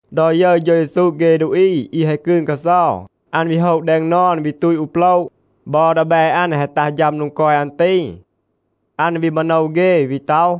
ดอ ยึร เฌา เยซู เฆ ดูอี อี แฮะ กืน กาเซา, อัน วี โฮะ แดง นอน, วี ตูต อู โปละ. บอ ดีแบ อัน แฮะ ตัห ฌัม โดง กอย อัน ตี. อัน วี มาโนว เฆ, วี ต็อห,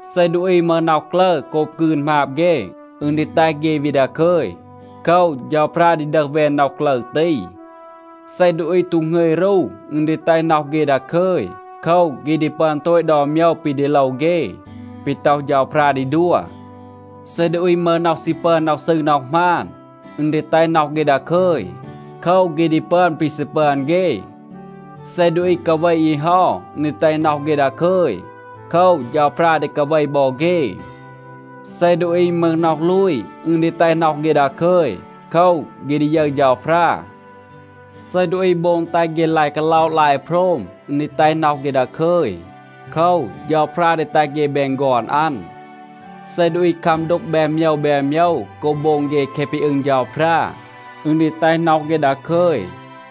เซ ดูอี มึห น็อห กลึร โกบ กืน หมาบ เฆ, อึณ ดี แตห เฆ วี ดาคึย. โคว, เฌาพรา ดี ดึห แวน น็อห กลึร ตี. เซ ดูอี ตู หงึย รู, อึณ ดี แตห น็อห เฆ ดาคึย. โคว, เฆ ดี ปึอน โตต ดอน โมยว ปี ดี โลว เฆ, ปี ต็อห เฌาพรา ดี ดัว. เซ ดูอี มึห น็อห ซี ปึอน น็อห ซืร น็อห หมาน, อึณ ดี แตห น็อห เฆ ดาคึย. โคว, เฆ ดี ปึอน ปี ซี ปึอน เฆ. เซ ดูอี กาเว อี เฮา, อึณ ดี แตห น็อห เฆ ดาคึย. โคว, เฌาพรา ดี กาเว บอ เฆ. เซ ดูอี มึห น็อห ลูย, อึณ ดี แตห น็อห เฆ ดาคึย. โคว, เฆ ดี ยึร เฌาพรา. เซ ดูอี โบง แตห เฆ ลาย กาล็อะ ลาย โพรม, อึณ ดี แตห น็อห เฆ ดาคึย. โคว, เฌาพรา ดี แตห เฆ แบน ฆอน อัน. เซ ดูอี คัม ดูก แบน โมยว แบน โมยว โกบ โบง เฆ แคะ ปี อึง เฌาพรา, อึณ ดี แตห น็อห เฆ ดาคึย.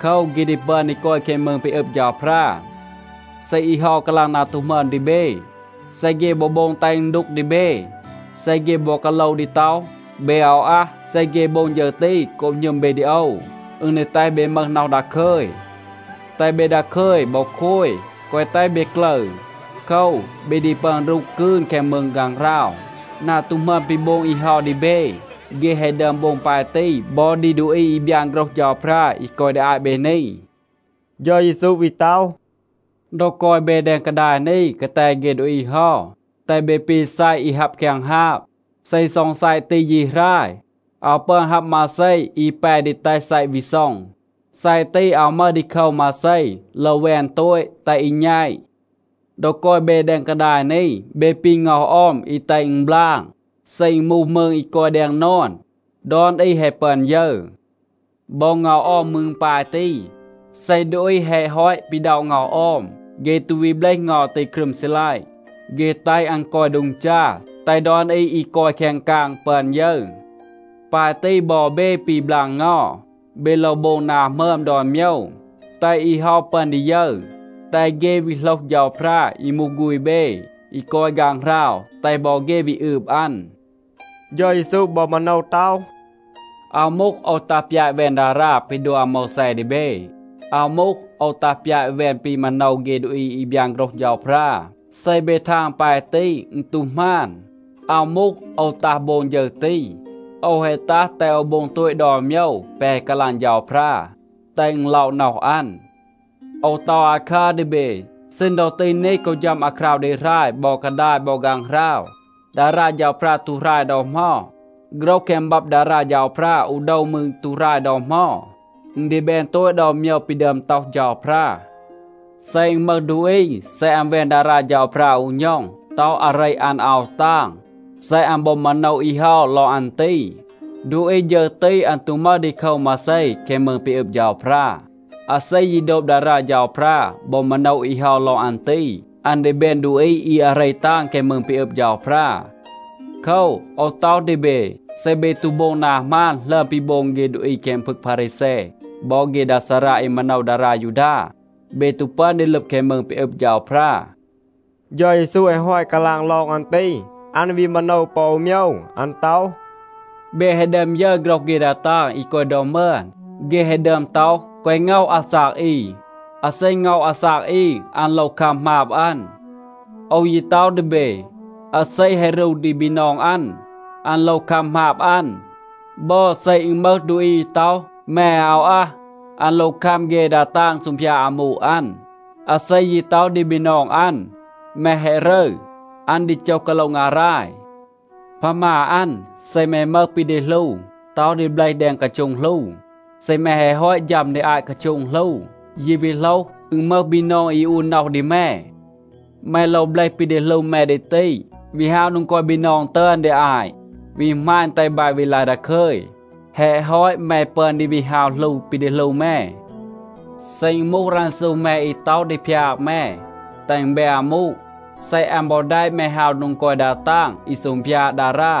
โคว, เฆ ดี ปึอน ดี กอย แคง มืง ปี อึบ เฌาพรา. เซ อี เฮา กาลาง นา ตู หมึอม ดี เบ, เซ เฆ บอ โบง แตห อึณ ดูก ดี เบ, เซ เฆ บอ กาโลว ดี ต็อห, เบ อาว อัห, เซ เฆ โบง ฌึร ตี โกบ หณึม เบ ดี โอว, อึณ ดี แตห เบ มึห น็อห ดาคึย. แตห เบ ดาคึย บอ โคย. แกวะ แตห เบ กลึร. โคว, เบ ดี ปึอน รูห กืน แคง มืง ฆางหราว. นา ตู หมึอม ปี โบง อี เฮา ดี เบ, เฆ แฮะ ดึอม โบง ปาย ตี บอ ดี ดูอี อี บยาน โฆรห เฌาพรา อี กอย ดี อาต เบ นี.” เฌา เยซู วี ต็อห, “ดอ กอย เบ แดง กาดาย นี กาแต เฆ ดูอี เฮา, แตห เบ ปี ซัยะ อี ฮับ แคง ฮาบ. เซ ซ็อง ซัยะ ตี ยี หราย, อาว ปึอน ฮับ มาเซ อี แป ดี แตห ซัยะ วี ซ็อง. ซัยะ ตี อาว มึห ดีโคว มาเซ. โลว แวน โตต, แตห อี แณต. ดอ กอย เบ แดง กาดาย นี, เบ ปี เงา ออม อี แตห อึณ บลาง. เซ อึณ มูห มืง อี กอย แดง นอน, ดอน อี แฮะ ปึอน ยึร. บอ เงา ออม มืร ปาย ตี. เซ ดูอี แฮะ ฮอต ปีด็อะ เงา ออม, เฆ ตู วี เบลห เงา ตี ครึม ซีลัยะ. เฆ แตห อัน กอย โดง จา, แตห ดอน อี อี กอย แคง กาง ปึอน ยึร. ปาย ตี บอ เบ ปี บลาง เงา. เบ โลว โบง นา หมึอม ดอน โมยว, แตห อี เฮา ปึอน ดี ยึร, แตห เฆ วี โหลห เฌาพรา อี มูห ฆูณ เบ อี กอย ฆางหราว, แตห บอ เฆ วี อืบ อัน.” เฌา เยซู บอ มาโนว ต็อห, “อาว มูห, โอว ตัห ปยาต แวน ดารา ปี ดัว อาโมวแซ ดี เบ. อาว มูห, โอว ตัห ปยาต แวน ปี มาโนว เฆ ดูอี อี บยาน โฆรห เฌาพรา. เซ เบ ทาง ปาย ตี, อึณ ตู หมาน. อาว มูห, โอว ตัห โบง ฌึร ตี. โอว แฮะ ตัห แตห โอว โบง โตต ดอน โมยว แปะ แฮะ กาลาง เฌาพรา, แตห อึณ ล็อะ น็อห อัน. โอว ต็อห อาคัร ดี เบ. ซีณ ดอ ตี นี, กอ ฌัม อาคราว ดี หราย บอ กาดาย บอ ฆางหราว, ดารา เฌาพรา ตู หราย ดอ เหมา. โฆรห แคง บับ ดารา เฌาพรา อู โดว มืร, ตู หราย ดอ เหมา. อึณ ดี แบน โตต ดอน โมยว ปี ดึอม ต็อห เฌาพรา. เซ อึณ มึห ดูอี, เซ อัน แวน ดารา เฌาพรา อู ณ็อง, ต็อห อาเร อัน อาว ตาง, เซ อัน บอ มาโนว อี เฮา ลอง อัน ตี, ดูอี ฌึร ตี, อัน ตู มึห ดีโคว มาเซ แคง มืง ปี อึบ เฌาพรา. อาเซ ยี โดบ ดารา เฌาพรา บอ มาโนว อี เฮา ลอง อัน ตี, อัน ดี แบน ดูอี อี อาเร ตาง แคง มืง ปี อึบ เฌาพรา. โคว, โอว ต็อห ดี เบ, เซ เบ ตู โบง นา หมาน หลึอม ปี โบง เฆ ดูอี แคง พึง พารีแซ บอ เฆ ดา ซารา อี มาโนว ดารา ยูดา, เบ ตู ปึอน ดี ลึบ แคง มืง ปี อึบ เฌาพรา.” เฌา เยซู แฮะ ฮอต กาลาง ลอง อัน ตี, อัน วี มาโนว ปอ อู โมยว. อัน ต็อห, “เบ แฮะ ดึอม ยึร โฆรห เฆ ดา ตาง อี กอย ดอ มึอน. เฆ แฮะ ดึอม ต็อห, ‘แกวะ ง็อห อาซาก อี. อาเซ ง็อห อาซาก อี, อัน โลว คัม หมาบ อัน.’ โอว ยี ต็อห ดี เบ, อาเซ แฮะ รู ดี บีนอง อัน, อัน โลว คัม หมาบ อัน. บอ, เซ อึณ มึห ดูอี อี ต็อห, ‘แม อาว อัห,’ อัน โลว คัม เฆ ดา ตาง ซูงพยาด อามู อัน. อาเซ ยี ต็อห ดี บีนอง อัน, ‘แม แฮะ รึร,’ อัน ดี โจห กาโละ งาราย. พามา อัน, เซ แม มึห ปี ดี หลู, ต็อห ดี เบลห แดง กาโช็ง หลู, เซ แม แฮะ ฮอต ฌัม ดี อาต กาโช็ง หลู, ยี วี โหลห, อึณ มึห บีนอง อี อูน น็อห ดี แม, แม โลว เบลห ปี ดี หลู แม ดี ตี, วี ฮาว โดง กอย บีนอง ตึอน ดี อาต, วี หมาณ แตห บาย วี ลาย ดาคึย. แฮะ ฮอต แม ปึอน ดี วี ฮาว หลู ปี ดี หลู แม. เซ อึณ มูห รันซู แม อี ต็อห ดี พยาก แม, แตห อึณ แบน อามู, เซ อัน บอ แดะ แม ฮาว โดง กอย ดา ตาง อี ซูงพยาด ดารา,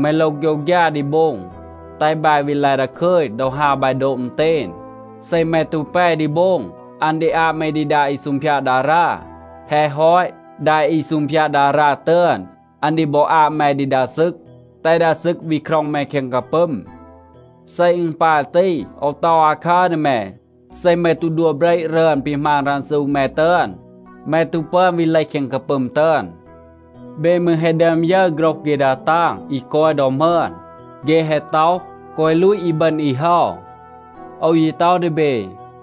แม โลว โฆยวฆยา ดี โบง, แตห บาย วี ลาย ดาคึย ดอ ฮาว บาย โดบ อึณเตณ. เซ แม ตู แป ดี โบง, อัน ดี อาบ แม ดี ดา อี ซูงพยาด ดารา. แฮะ ฮอต, ดา อี ซูงพยาด ดารา ตึอน, อัน ดี บอ อาบ แม ดี ดา ซึก, แตห ดา ซึก วี คร็อง แม แคง กาปึม. เซ อึณ ปาย ตี, โอว ต็อห อาคัร ดี แม, เซ แม ตู ดัว เบระ รึอน ปี หมาณ รันซู แม ตึอน, แม ตู ปึอน วี เลห แคง กาปึม ตึอน. เบ มืร แฮะ ดึอม ยึร โฆรห เฆ ดา ตาง อี กอย ดอ มึอน. เฆ แฮะ ต็อห, ‘แกวะ ลูต อีบึณ อี เฮา.’ โอว ยี ต็อห ดี เบ,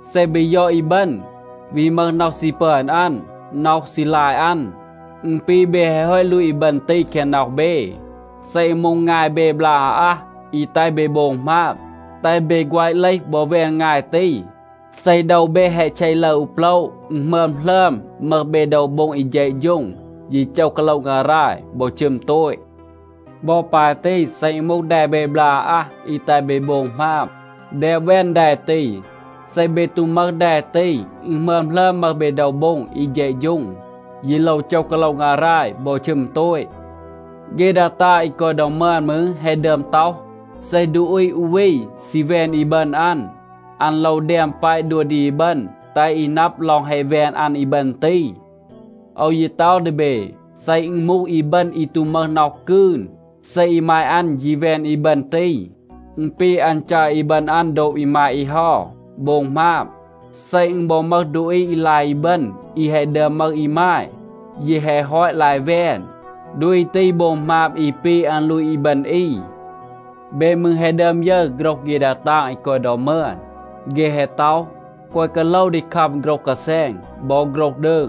เซ เบ ยอด อีบึณ, วี มึห น็อห ซี ปึอน อัน, น็อห ซี ลาย อัน, อึณ ปี เบ แฮะ ฮอต ลูต อีบึณ ตี แคง น็อห เบ. เซ อึณ มูห งาย เบ บลาก อาอัห อี แตห เบ โบง หมาบ, แตห เบ แฆวะ เลห บอ แวน งาย ตี. เซ โดว เบ แฮะ เช ลึร อู โปละ, อึณ หมึอม หลึอม มึห เบ โดว โบ็ง อี เฌะฌูง, ยี โจห กาโละ งาราย บอ ชึม โตต. บอ ปาย ตี. เซ อึณ มูห แด เบ บลาก อาอัห อี แตห เบ โบง หมาบ, แดบ แวน แด ตี. เซ เบ ตู มึห แด ตี, อึณ หมึอม หลึอม มึห เบ โดว โบ็ง อี เฌะฌูง, ยี โลว โจห กาโละ งาราย บอ ชึม โตต. เฆ ดา ตาง อี กอย ดอ มึอน มืร แฮะ ดึอม ต็อห, ‘เซ ดูอี อู วี ซี แวน อีบึณ อัน, อัน โลว แดม แปะ ดัว ดี อีบึณ แตห อี นับ ลอง แฮะ แวน อัน อีบึณ ตี.’ โอว ยี ต็อห ดี เบ, เซ อึณ มูห อีบึณ อี ตู มึห น็อห กืน, เซ อีมาย อัน ยี แวน อีบึณ ตี, อึณ ปี อัน จัร อีบึณ อัน โดบ อีมาย อี เฮา, โบง หมาบ. เซ อึณ บอ มึห ดูอี อี ลาย อีบึณ อี แฮะ ดึอม มึห อีมาย, ยี แฮะ ฮอต ลาย แวน, ดูอี ตี โบง หมาบ อี ปี อัน ลูต อีบึณ อี. เบ มืร แฮะ ดึอม ยึร โฆรห เฆ ดา ตาง อี กอย ดอ มึอน. เฆ แฮะ ต็อห, ‘แกวะ กาโลว ดี คัม โฆรห กาแซณ บอ โฆรห ดืง.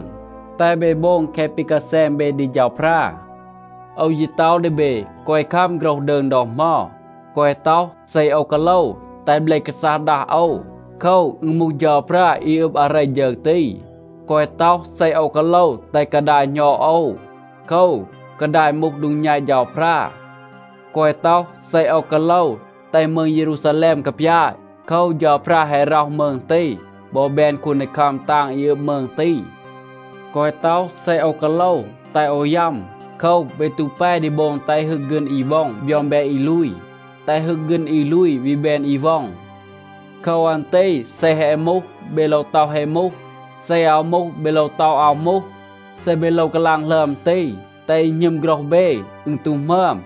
แตห เบ โบง แคะ ปี กาแซณ เบ ดี เฌาพรา.’ โอว ยี ต็อห ดี เบ, แกวะ คัม โฆรห ดืง ดอ เหมา. แกวะ ต็อห, ‘เซ โอว กาโลว, แตห เบล กาซัห ดัห โอว.’ โคว, อึณ มูห เฌาพรา, อี อึบ อาเร ฌึร ตี. แกวะ ต็อห, ‘เซ โอว กาโลว, แตห กาดาย หณอด โอว.’ โคว, กาดาย มูห โดง แณต เฌาพรา. แกวะ ต็อห, ‘เซ โอว กาโลว, แตห มืง เยรูซาแลม กาปยาต.’ โคว, เฌาพรา แฮะ ร็อห มืง ตี บอ แบน คูนดีคัม ตาง อี อึบ มืง ตี. แกวะ ต็อห, ‘เซ โอว กาโลว, แตห โอว ยัม.’ โคว, เบ ตู แป ดี โบง แตห ฮึก ฆีณ อี ว็อง บยอง แบน อี ลูย, แตห ฮึก ฆีณ อี ลูย วี แบน อี ว็อง. โคว อัน ตี เซ แฮะ มูห, เบ โลว ต็อห, ‘แฮะ มูห.’ เซ อาว มูห, เบ โลว ต็อห, ‘อาว มูห.’ เซ เบ โลว กาลาง หลึอม ตี, แตห อี หณึม โฆรห เบ, อึณ ตู หมึอม.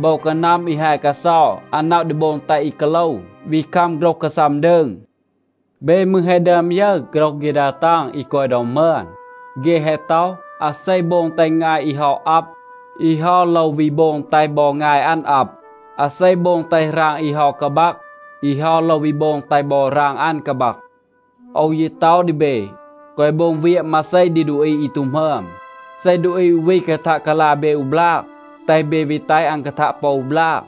โบว กานัม อี ฮาย กาเซา, อัน นับ ดี โบง แตห อี กาโลว, วี คัม โฆรห กาซัม ดืง. เบ มืร แฮะ ดึอม ยึร โฆรห เฆ ดา ตาง อี กอย ดอ มึอน. เฆ แฮะ ต็อห, ‘อาเซ โบง แตห งาย อี เฮา อับ, อี เฮา โลว วี โบง แตห บอ งาย อัน อับ. อาเซ โบง แตห หราง อี เฮา กาบัก, อี เฮา โลว วี โบง แตห บอ หราง อัน กาบัก.’ โอว ยี ต็อห ดี เบ, แกวะ โบง เวียะ มาเซ ดี ดูอี อี ตู หมึอม. เซ ดูอี อู วี กาทัะ กาลา เบ อู บลาก, แตห เบ วี แตห อัน กาทัะ ปอ อู บลาก.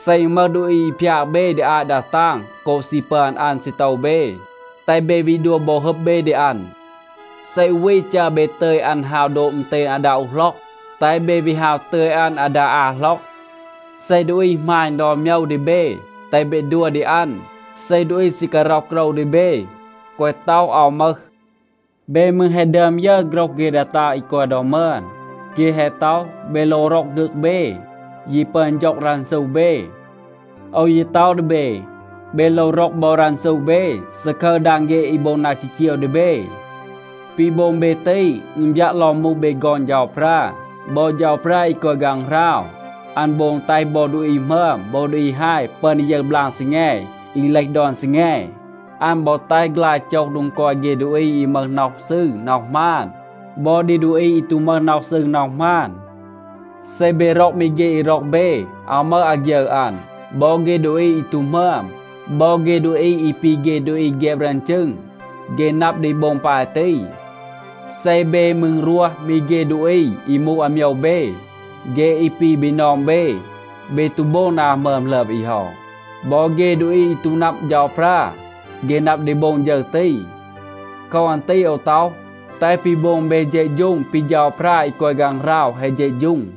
เซ อึณ มึห ดูอี อี พยาก เบ ดี อาต ดา ตาง โกบ ซี ปึอน อัน ซีโตว เบ, แตห เบ วี ดัว บอ ฮึบ เบ ดี อัน. เซ อู วี จัร เบ ตึย อัน ฮาว โดบ อึณเตณ อาดา อู หล็อก, แตห เบ วี ฮาว ตึย อัน อาดา อา หล็อก. เซ ดูอี หมาณ ดอน โมยว ดี เบ, แตห เบ ดัว ดี อัน. เซ ดูอี ซี การ็อห โกรว ดี เบ, แกวะ ต็อห, อาว มึห. เบ มืร แฮะ ดึอม ยึร โฆรห เฆ ดา ตาง อี กอย ดอ มึอน. เฆ แฮะ ต็อห, ‘เบ โลว ร็อก ฆึก เบ, ยี ปึอน ฌ็อง รันซู เบ.’ โอว ยี ต็อห ดี เบ, เบ โลว ร็อก บอ รันซู เบ, ซาคึร ดาง เฆ อี โบง นา จีจีว ดี เบ. ปี โบง เบ ตี, อึณ บยัะ ลอง มูห เบ ฆอน เฌาพรา. บอ เฌาพรา อี กอย ฆางหราว, อัน โบง แตห บอ ดูอี หมึอม บอ ดูอี ฮาย ปึอน ดี ยึร บลาง ซีแง อี เลห ดอน ซีแง. อัน บอ แตห ฆลาย โจห โดง กอย เฆ ดูอี อี มึห น็อห ซืร น็อห หมาน บอ ดี ดูอี อี ตู มึห น็อห ซืร น็อห หมาน. เซ เบ ร็อก มี เฆ อี ร็อก เบ, อาว มึห อาฆยึร อัน. บอ เฆ ดูอี อี ตู หมึอม บอ เฆ ดูอี อี ปี เฆ ดูอี แฆบ รึอน จึง, เฆ นับ ดี โบง ปาย ตี. เซ เบ มืร รวห มี เฆ ดูอี อี มูห อาโมยว เบ, เฆ อี ปี บีนอง เบ, เบ ตู โบง นา หมึอม หลึอม อี เฮา. บอ เฆ ดูอี อี ตู นับ เฌาพรา, เฆ นับ ดี โบง ฌึร ตี. โคว อัน ตี โอว ต็อห, แตห ปี โบง เบ เฌะฌูง ปี เฌาพรา อี กอย ฆางหราว แฮะ เฌะฌูง.”